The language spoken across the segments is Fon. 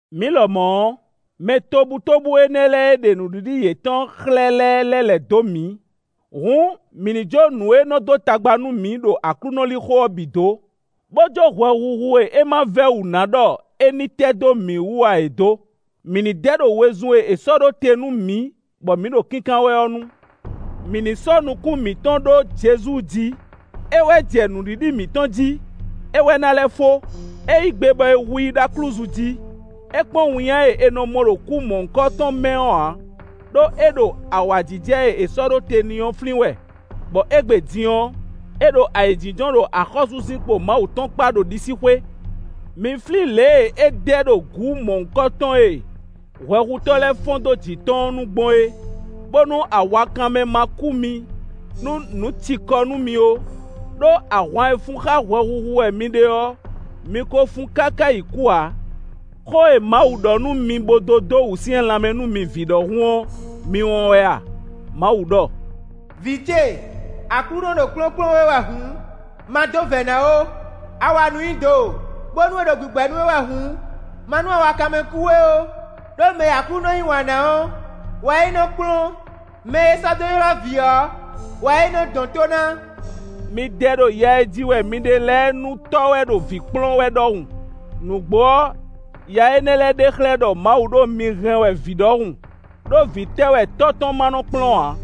Mǐ lɔmɔ̌ ɔ́, mɛ tobutóbú énɛ́ lɛ́ɛ e ɖe nǔɖiɖi yětɔn xlɛ́ lɛ́ɛ lɛ́ lɛ̌ dó mǐ; hǔn, mǐ ní jó nǔ e nɔ dó tagba nú mǐ ɖo Aklúnɔ lixo ɔ́ bǐ dǒ, bó jó hwɛhuhu e é ma vɛ́ wǔ ná ɖɔ é ní tɛ́ dó mǐ wú ǎ é dó. Mǐ ní dɛ ɖo wezun e è sɔ́ ɖó te nú mǐ bɔ mǐ ɖo kínkán wɛ ɔ́ nu. Mǐ ní sɔ́ nukún mǐtɔn ɖó Jezu jí; é wɛ jɛ nǔɖiɖi mǐtɔn jí; é wɛ ná lɛ́ fó. É yí gbe bɔ è hu i ɖó aklúzu jí; é kpɔ́n winnyá e è nɔ mɔ ɖo kú mɔ̌hunkɔtɔn mɛ ɔ́ ǎ, ɖó é ɖo awǎjijɛ e è sɔ́ ɖó te n'i ɔ́ flín wɛ, bɔ égbé din ɔ́, é ɖo ayǐjínjɔ́n ɖo axɔ́súzinkpo Mawu tɔn kpá ɖo ɖisíxwé. Mi flín lě e é dɛ ɖo gǔ mɔ̌hunkɔtɔn e hwɛhutɔ́ lɛ́ɛ fɔ́n dó jǐ tɔn ɔ́ nu gbɔn é, bónú awakanmɛ ma kú mi, nú nǔ ci kɔ nú mi ó; ɖó ahwan e fun xá hwɛhuhu wɛ mi ɖe ɔ́, mi ko fun káká yi kú ǎ. Xó e Mawu ɖɔ nú mi bó dó dó wǔsyɛ́n lanmɛ nú mi vǐ ɖɔhun ɔ́, mi wɔn wɛ a? Mawu ɖɔ: “Vǐ ce, Aklúnɔ ɖo kplɔ́nkplɔ́n we wɛ hǔn, ma dó vɛ̌ ná ó. A wa nǔ nyi do bónú é ɖo gbǐgbɛ́ nú we wɛ hǔn, ma nú awakanmɛ kú we ó; ɖó mɛ e Aklúnɔ yí wǎn ná ɔ́ wɛ é nɔ kplɔ́n; mɛ e é sɔ́ dó ylɔ́ vǐ ɔ́ wɛ é nɔ dɔn tó ná.” Mi dɛ ɖo ya e ji wɛ mi ɖe lɛ́ɛ nu, tɔ́ wɛ ɖo vǐ kplɔ́n wɛ ɖɔhun; nǔgbó ɔ́, ya énɛ́ lɛ́ɛ ɖe xlɛ́ ɖɔ Mawu ɖo mǐ hɛn wɛ vǐ ɖɔhun; ɖó vǐ tɛ́ wɛ tɔ́ tɔn ma nɔ kplɔ́n ǎ?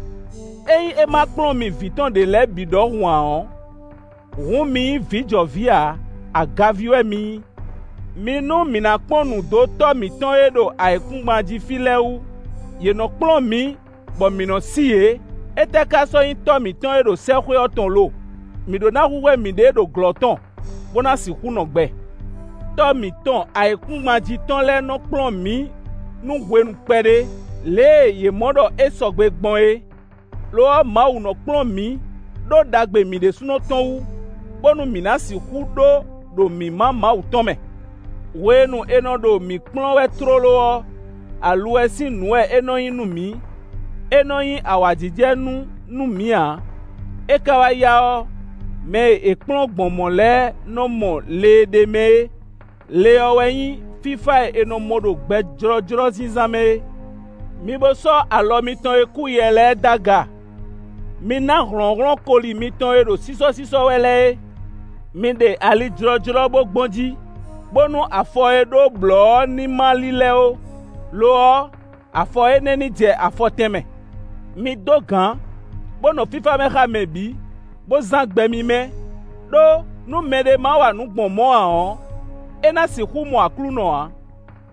Ényí é ma kplɔ́n mi vǐ tɔn ɖě lɛ́ɛ bǐ ɖɔhun ǎ ɔ́, hǔn mi nyí vǐ jɔ vǐ ǎ, agaví wɛ mi nyí. Mi nú mǐ ná kpɔ́n nǔ dó tɔ́ mǐtɔn e ɖo ayǐkúngban jí fí lɛ́ɛ wú; yě nɔ kplɔ́n mǐ bɔ mǐ nɔ sí yě. Étɛ́ ka sɔ́ nyí Tɔ́ mǐtɔn e ɖo sɛ́xwé ɔ́ tɔn lo? Mǐ ɖó ná hwíhwɛ́ mǐɖée ɖo glɔ́ tɔn, bó ná sixú nɔ gbɛ. Tɔ́ mǐtɔn ayǐkúngban jí tɔn lɛ́ɛ nɔ kplɔ́n mǐ nú hwenu kpɛɖé, lě e yě mɔ ɖɔ é sɔgbe gbɔn é. Lo ɔ́, Mawu nɔ kplɔ́n mǐ ɖó ɖagbe mǐ ɖésúnɔ tɔn wú, bónú mǐ ná sixú ɖó ɖo mǐmá Mawu tɔn mɛ. Hwenu e è nɔ ɖo mǐ kplɔ́n wɛ tlóló ɔ́, aluwɛ sín nǔ wɛ é nɔ nyí nú mǐ; é nɔ nyí awǎjijɛnú nú mǐ ǎ. É ka wá yá ɔ́, mɛ e è kplɔ́n gbɔn mɔ̌ lɛ́ɛ nɔ mɔ le e ɖ'é mɛ é; le ɔ́ wɛ nyí fífá e è nɔ mɔ ɖo gbɛ jlɔ́jlɔ́ zínzán mɛ é. Mi bo sɔ́ alɔ mitɔn e kúyɛ lɛ́ɛ d'aga; mi ná hlɔ̌nhlɔ́n koli mitɔn e ɖo sísɔ́sísɔ́ wɛ lɛ́ɛ é. Mi ɖe ali jlɔ́jlɔ́ bó gbɔn jí, bónú afɔ e ɖó blɔ̌ ɔ́ ní ma lílɛ́ ó; lo ɔ́, afɔ énɛ́ ní jɛ afɔ tɛnmɛ. Mi dó gǎn, bó nɔ fífá mɛ xá mɛ bǐ, bó zán gbɛ mímɛ́; ɖó, nú mɛɖé ma wa nǔ gbɔn mɔ̌ ǎ ɔ́, é ná sixú mɔ Aklúnɔ ǎ.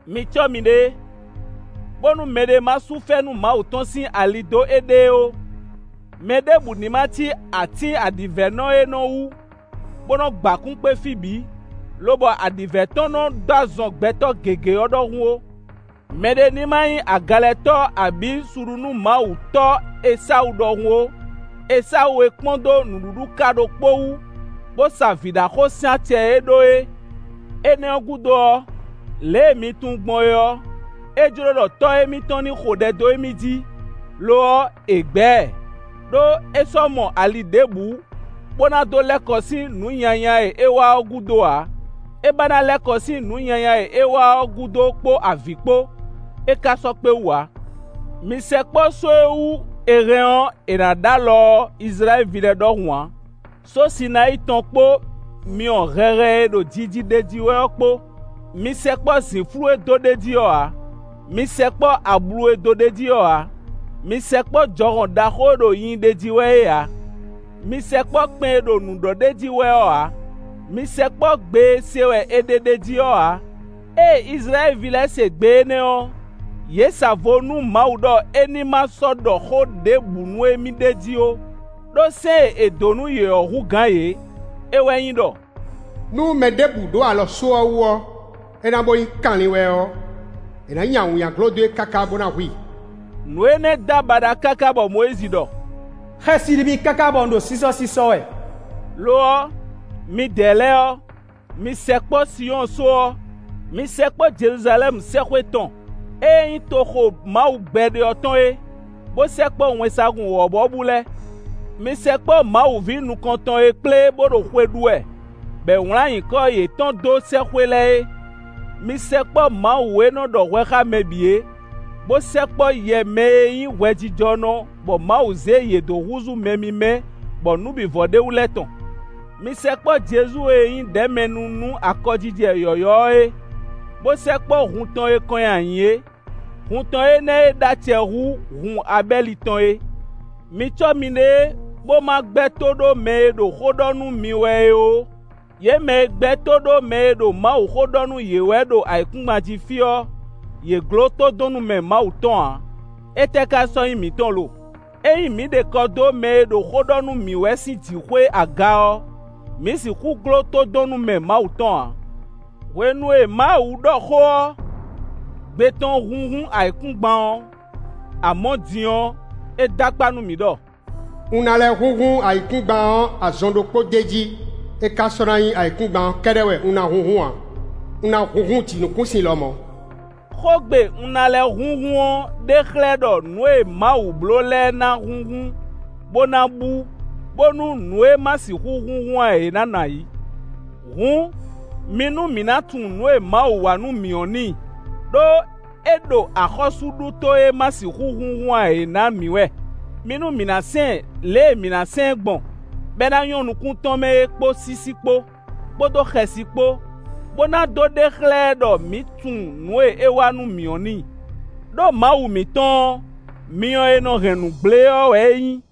Mi cɔ́ miɖée, bónú mɛɖé ma sú fɛ́nú Mawu tɔn sín ali dó éɖée ó. Mɛɖěbǔ ní ma cí atín aɖǐvɛ́nɔ e nɔ wú, bó nɔ gba kún kpé fí bǐ, lobɔ aɖǐvɛ́ tɔn nɔ dó azɔn gbɛtɔ́ gěgé ɔ́ ɖɔhun ó. Mɛ ɖé ní ma nyí agalɛtɔ́ abǐ suɖunúmawutɔ́ Esawu ɖɔhun ó; Esawu e kpɔ́n dó nǔɖuɖu ká ɖokpó wú, bó sa vǐɖaxó sín acɛ e é ɖó é. Énɛ́ ɔ́ gúdo ɔ́, lě e mi tunwun gbɔn é ɔ́, é jló ɖɔ tɔ́ émítɔn ní xo ɖɛ dó émí jí; lo ɔ́, è gbɛ́ ɛ, ɖó é sɔ́ mɔ ali ɖěbǔ, bó ná dó lɛ́ kɔ sín nǔ nyanya e é wa ɔ́ gúdo ǎ; é ba ná lɛ́ kɔ sín nǔ nyanya e é wa ɔ́ gúdo kpó avǐ kpó; é ka sɔ́ kpé wú ǎ. Mi sɛkpɔ́ só e wú è hɛn ɔ́, è nǎ ɖ'alɔ ɔ́ Izlayɛ́li ví lɛ́ɛ ɖɔhun ǎ: só Sinayíi tɔn kpó myɔ hɛhɛ e ɖo jiji ɖ'é jí wɛ ɔ́ kpó; mi sɛkpɔ́ zǐnflú e dó ɖ'é jí ɔ́ ǎ; mi sɛkpɔ́ ablu e dó ɖ'é jí ɔ́ ǎ; mi sɛkpɔ́ jɔhɔn ɖaxó e ɖo nyinyi ɖ'é jí wɛ é ǎ. Mi sɛkpɔ́ kpɛn e ɖo nǔ ɖɔ ɖ'é jí wɛ ɔ́ ǎ; mi sɛkpɔ́ gbe e se wɛ è ɖe ɖ'é jí ɔ́ ǎ. Ée Izlayɛ́li ví lɛ́ɛ se gbe énɛ́ ɔ́, yě sa vo nú Mawu ɖɔ é ní ma sɔ́ ɖɔ xó ɖěbǔ nú émí d'é jí ó; ɖó sɛ́n e è dǒ nú yě ɔ́ hú gǎn yě; é wɛ nyí ɖɔ: “Nú mɛ ɖěbǔ ɖó alɔ só ɔ́ wú ɔ́, é ná bo nyí kanlin wɛ ɔ́, è nǎ nyi awǐnnya dó e káká bó ná hu i.” Nǔ énɛ́ dó abaɖa káká bɔ Mɔyízi ɖɔ: “Xɛsi ɖi mì káká bɔ un ɖo sísɔ́sísɔ́ wɛ.” Lo ɔ́, midɛɛ lɛ́ɛ ɔ́, mi sɛkpɔ́ Sinyɔ́ɔ só ɔ́; mi sɛkpɔ́ Jeluzalɛ́mu sɛ́xwé tɔn, ée nyí toxo Mawu gbɛɖe ɔ́ tɔn é, bó sɛkpɔ́ wɛnsagun wɔ̌buwɔ́bú lɛ́ɛ. Mi sɛkpɔ́ Mawu ví nukɔn tɔn e kplé bó ɖo xwe ɖu wɛ, bɔ è wlǎn nyǐkɔ yětɔn ɖó sɛ́xwé lɛ́ɛ é. Mi sɛkpɔ́ Mawu e nɔ ɖɔ hwɛ xá mɛ bǐ e, bó sɛkpɔ́ yɛ mɛ e nyí hwɛjijɔnɔ bɔ Mawu zé yě dó húzú mɛ mímɛ́ bɔ nǔ bǐ vɔ ɖ'é wú lɛ́ɛ tɔn. Mi sɛkpɔ́ Jezu e nyí ɖɛ̌mɛnu nú akɔjijɛ yɔ̌yɔ́ ɔ́ é; bó sɛkpɔ́ hun tɔn e kɔn nyi ayǐ é, hun tɔn énɛ́ e ɖó acɛ hú hun Abɛ́li tɔn é. Mi cɔ́ miɖée bó ma gbɛ́ tó ɖó mɛ e ɖo xó ɖɔ nú mi wɛ é ó. Yě mɛ e gbɛ́ tó ɖó mɛ e ɖo Mawuxó ɖɔ nú yě wɛ ɖo ayǐkúngban jí fí ɔ́, yě gló tódɔnnúmɛ Mawu tɔn ǎ. Étɛ́ ka sɔ́ nyí mǐtɔn lo? Ényí mǐ ɖe kɔ dó mɛ e ɖo xó ɖɔ nú mǐ wɛ sín jǐxwé aga ɔ́, mǐ sixú gló tódɔnnúmɛ Mawu tɔn ǎ. Hwenu e Mawu ɖɔ xó ɔ́, gbe tɔn húnhún ayǐkúngban ɔ́. Amɔ̌ din ɔ́, é dó akpá nú mǐ ɖɔ: “Un ná lɛ́ húnhún ayǐkúngban ɔ́ azɔn ɖokpó d'é jí; é ka sɔ́ ná nyí ayǐkúngban ɔ́ kɛ́ɖɛ́ wɛ un ná húnhún ǎ; un ná húnhún jǐnukúnsin lɔmɔ̌.” Xógbe “un ná lɛ́ húnhún” ɔ́ ɖe xlɛ́ ɖɔ nǔ e Mawu bló lɛ́ɛ ná húnhún, bó ná bú, bónú nǔ e ma sixú húnhún ǎ é ná nɔ ayǐ. Hǔn, mi nú mǐ ná tunwun nǔ e Mawu wa nú mǐ ɔ́ n'i; ɖó é ɖo axɔ́súɖuto e ma sixú húnhún ǎ é ná mǐ wɛ. Mi nú mǐ ná sɛn ɛ lě e mǐ ná sɛn ɛ gbɔn, bɔ é ná nyɔ́ nukún tɔn mɛ é kpó sísí kpó, kpódó xɛsi kpó, bó ná dó ɖe xlɛ́ ɛ ɖɔ mǐ tunwun nǔ e é wa nú mǐ ɔ́ n'i. Đó Mawu mǐtɔn ɔ́, myɔ e nɔ hɛn nǔ gblé ɔ́ wɛ é nyí.